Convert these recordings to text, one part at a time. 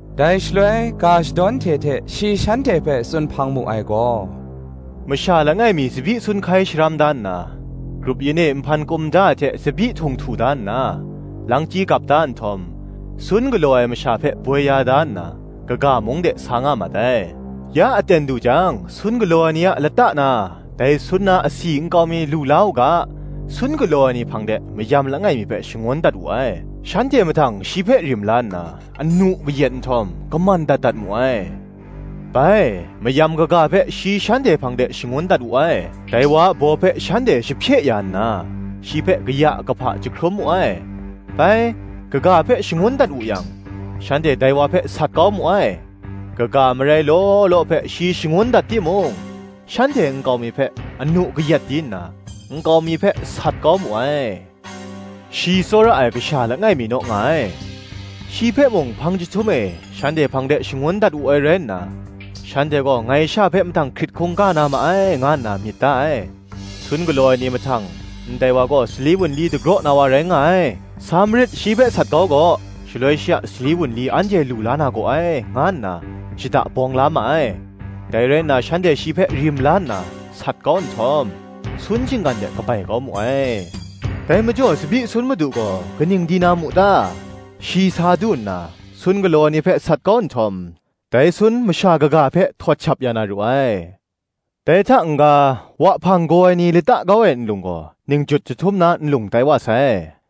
Dai shaloi ga shadawn hte hte shi shanhte hpe tsun hpang mu ai gaw, “Masha langai mi tsabyi sun hkai sharam da nna, grup yin e nhpan kum da ai hte tsabyi htung htu da nna, langchyi gap da nhtawm, sun galaw ai masha hpe boi ya da nna, kaga mung de sa nga mat ai. Ya aten du jang, sun galaw ai ni a lata na, dai sun na asi nkau mi lu la u ga, sun galaw ai ni hpang de, mayam langai mi hpe shangun dat wu ai. Shanhte mahtang, shi hpe rim la nna, anu kayat nhtawm, kaman dat dat mu ai. Bai, mayam kaga hpe, shi shanhte hpang de shangun dat wu ai: dai wa a baw hpe shanhte shahpye ya nna, shi hpe kaya kahpa jahkrum mu ai. Bai, kaga hpe shangun dat wu yang, shanhte dai wa hpe sat kau mu ai: kaga marai law law hpe shi shangun dat timung, shanhte nkau mi hpe anu kayat di nna, nkau mi hpe sat kau mu ai. Shi tsawra ai kasha langai mi naw nga ai: shi hpe mung hpang jahtum e, shanhte hpang de shangun dat wu ai rai nna, Shanhte gaw ngai sha hpe mahtang hkrit hkungga na ma ai, nga nna myit da ai. Sun galaw ai ni mahtang, ‘Ndai wa gaw, sali wunli dagraw na wa rai nga ai; sa marit, shi hpe sat kau gaw; shaloi shi a sali wunli, anhte lu la na gaw ai,’ nga nna shada bawng la ma ai. Dai rai nna, shanhte shi hpe rim la nna, sat kau nhtawm, sun shinggan de kabai kau mu ai. Dai majaw, tsabyi sun madu gaw, kaning di na mu ta? Shi sa du nna, sun galaw ai ni hpe sat kau nhtawm, dai sun masha kaga hpe, htawt shap ya na ru ai. Dai hta n-ga, Wahpang gaw ai ni, lata kau ai nlung gaw, Ningjut jahtum na nlung tai wa sai: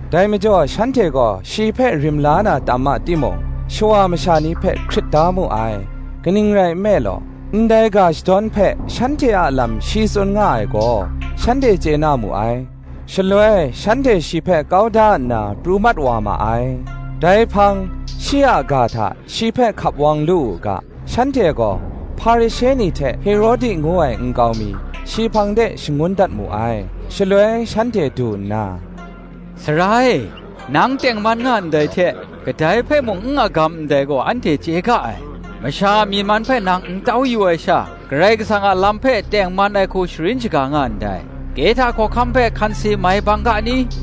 Dai majaw shanhte gaw shi hpe rim la na tam ma timung, shawa masha ni hpe hkrit da mu ai: kaning rai nme law, ndai ga shadawn hpe, shanhte a lam shi tsun nga ai gaw, shanhte chye na mu ai. Shaloi shanhte shi hpe kau da nna, pru mat wa ma ai. Dai hpang, shi a ga hta shi hpe hkap wang lu u ga, shanhte gaw, Hparishe ni hte Herodi ngu ai ni nkau mi, shi hpang de shangun dat mu ai. Shaloi shanhte du nna, “Sara e, nang tengman nga ndai hte, kadai hpe mung n agam nga ndai gaw anhte chye ga ai; masha a myi man hpe nang n tau yu ai sha, Karai Kasang a lam hpe tengman ai hku sharin shaga nga ndai. Kehta hkawhkam hpe hkanse mai bang ga ni?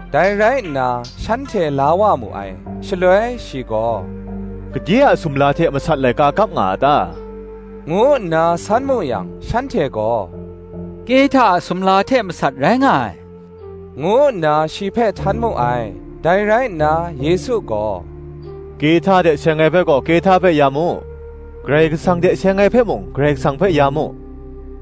Dai rai nna, shanhte la wa mu ai. Shaloi shi gaw, “Gade a sumla hte masat laika kap nga a ta?” ngu nna san mu yang, shanhte gaw, “Kehta a sumla hte masat rai nga ai,” ngu nna shi hpe htan mu ai. Dai rai nna Yesu gaw, “Kehta hte seng ai hpe gaw, Kehta hpe ya mu; Karai Kasang hte seng ai hpe mung Karai Kasang hpe ya mu,”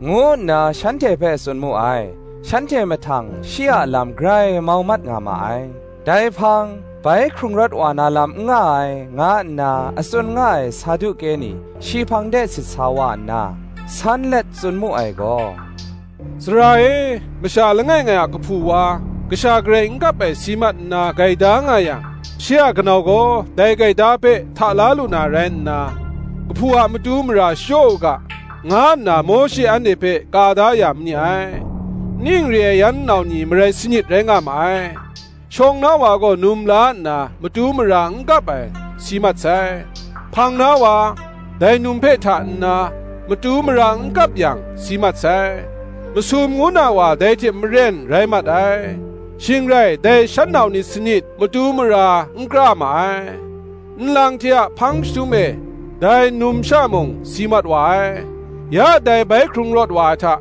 ngu nna shanhte hpe tsun mu ai. Shanhte mahtang, shi a lam grai mau mat nga ma ai. Dai hpang, bai hkrung rawt wa na lam n nga ai, nga nna a tsun nga ai Saduke ni shi hpang de sit sa wa nna, san let tsun mu ai gaw, “Sara e, masha langai ngai a kahpu wa, kasha garai n kap ai si mat nna gaida nga yang, shi a kanau gaw dai gaida hpe hta la lu na rai nna, kahpu a matu mara shachyaw u ga, nga nna Mawshe anhte hpe ka da ya ma ni ai. Ning re ai yan nau ni marai sanit rai nga ma ai. Shawng na wa gaw num la nna, matu mara n kap ai, si mat sai. Hpang na wa, dai num hpe hta nna, matu mara n kap yang, si mat sai: masum ngu na wa dai hte maren rai mat ai: shing rai dai shan nau ni sanit, matu mara n kra ma ai. Nlang hte a hpang jahtum e, dai numsha mung, si mat wa ai. Ya, dai bai hkrung rawt ai hta,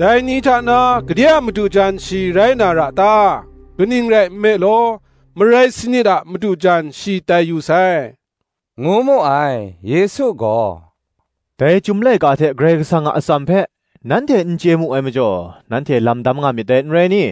dai ni hta na gade a madu jan shi rai na ra ta? Kaning rai nme law, marai sanit a madu jan shi tai yu sai,” ngu mu ai. Yesu gaw, “Dai Chyum Laika hte, Karai Kasang a atsam hpe, nanhte n chye mu ai majaw, nanhte lam dam nga myit dai, n rai ni?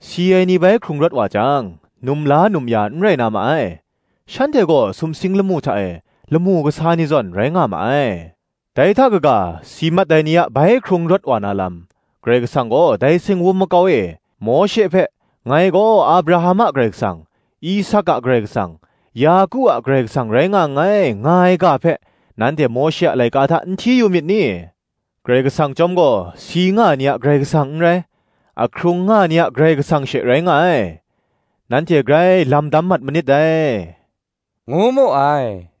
Si ai ni bai hkrung rawt wa jang, num la num ya n rai na ma ai: shanhte gaw sumsing lamu hta e, lamu kasa ni zawn, rai nga ma ai. Dai hta kaga, si mat ai ni a bai hkrung rawt wa na lam, Karai Kasang gaw dai singwum makau e, Mawshe hpe, Ngai gaw Abraham a Karai Kasang, Isak a Karai Kasang, Yaku a Karai Kasang rai nga nngai, nga ai ga hpe, nanhte Mawshe a laika hta n hti yu myit ni? Karai Kasang chyawm gaw, si nga ai ni a Karai Kasang n rai, ahkrung nga ai ni a Karai Kasang she rai nga ai: nanhte grai lam dam mat manit dai,” ngu mu ai.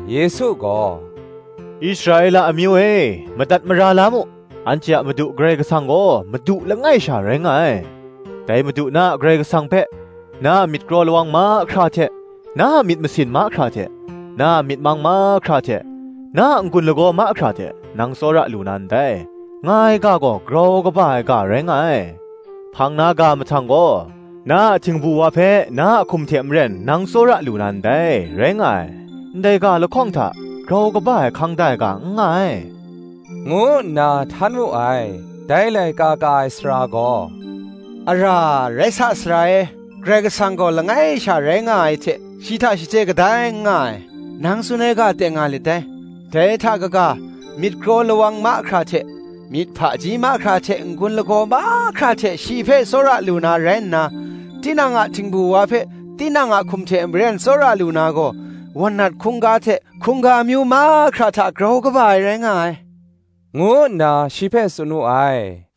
Yesu gaw, “Israela amyu e, madat mara la mu; Anhte a Madu Karai Kasang gaw Madu langai sha rai nga ai: Dai Madu, na a Karai Kasang hpe, na a myit kraw lawang mahkra hte, na a myit masin mahkra hte, na a myit mang mahkra hte, na a n-gun lagaw mahkra hte, nang tsawra lu na ndai, nga ai ga gaw, grau kaba ai ga rai nga ai. Hpang na ga mahtang gaw, Na a htingbu wa hpe, na a hkum hte maren nang tsawra lu na ndai, rai nga ai. Ndai ga lahkawng hta, grau kaba ai hkang da ai ga n nga ai,” ngu nna htan wu ai. Dai laika ka ai sara gaw, “Ara, rai sa, Sara e; Karai Kasang gaw langai sha rai nga ai hte, shi hta shaje kadai n nga ai, nang tsun ai ga teng nga lit dai: dai hta kaga, myit kraw lawang mahkra hte, myit hpaji mahkra hte, n-gun lagaw mahkra hte shi hpe tsawra lu na rai nna, tinang a htingbu wa hpe tinang a hkum hte maren tsawra lu na gaw, wan nat hkungga hte hkungga amyu mahkra hta grau kaba ai rai nga ai,” ngu nna shi hpe tsun wu ai.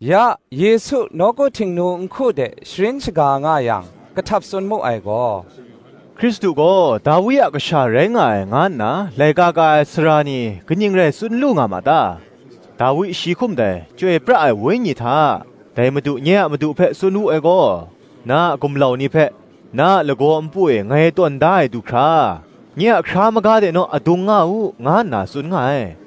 Ya Yesu nawku Htingnu nhku de sharin shaga nga yang, kahtap tsun mu ai gaw, Hkristu gaw, Dawi a kasha rai nga ai, nga nna laika ka ai sara ni, kaning rai tsun lu nga ma ta? Dawi shi hkum dai, Chyoi pra ai Wenyi hta, Dai Madu nye a madu hpe tsun wu ai gaw: “Na a gumlau ni hpe, na a lagaw npu e ngai tawn da ai du hkra, Nye a hkra maga de naw adung nga u,” nga nna tsun nga ai.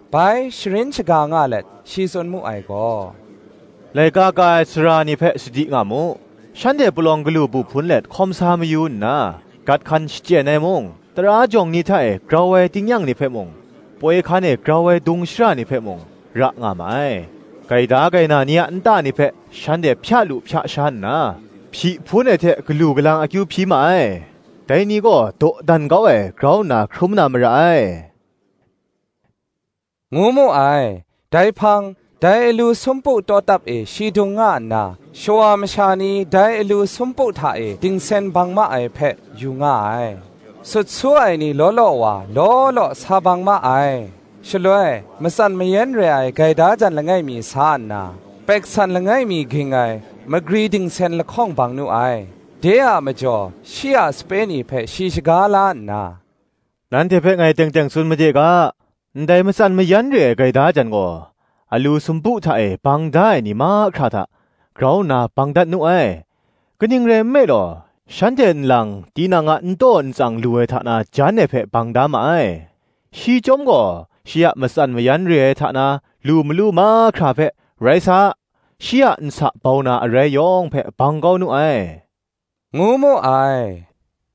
Bai sharin shaga nga let, shi tsun mu ai gaw, “Laika ka ai sara ni hpe sadi nga mu: shanhte palawng galu bu hpun let hkawm sa mayu nna gat hkan shachyen ai mung, tara jawng ni hta e grau ai tingnyang ni hpe mung, poi hkan e grau ai dung shara ni hpe mung, ra nga ma ai: gaida gaina ni a nta ni hpe, shanhte hpya lu hpya sha nna, hpyi hpun ai hte galu galang akyu hpyi ma ai. Dai ni gaw dawdan kau ai grau nna hkrum na mara ai,” ngu mu ai. Dai hpang, dai alu sumpu tawtap e shi dung nga nna, shawa masha ni dai alu sumpu hta e dingsen bang ma ai hpe, yu nga ai. Sut su ai ni law law wa, law law sa bang ma ai. Shaloi, matsan mayan re ai gaida jan langai mi sa nna, gumhpraw lap mi ging ai, magri dingsen lahkawng bang nu ai. De a majaw, shi a sape ni hpe shi shaga la nna, “Nanhte hpe ngai teng teng tsun made ga, ndai matsan mayan re ai gaida jan gaw, alu sumpu hta e bang da ai ni mahkra hta, grau nna bang dat nu ai. Kaning rai nme law, shanhte nlang, tinang a n taw n tsang lu ai hta na jan ai hpe bang da ma ai; shi chyawm gaw shi a matsan mayan re ai hta na lu malu mahkra hpe, rai sa, shi a nsa bau na arai yawng hpe, bang kau nu ai,” ngu mu ai.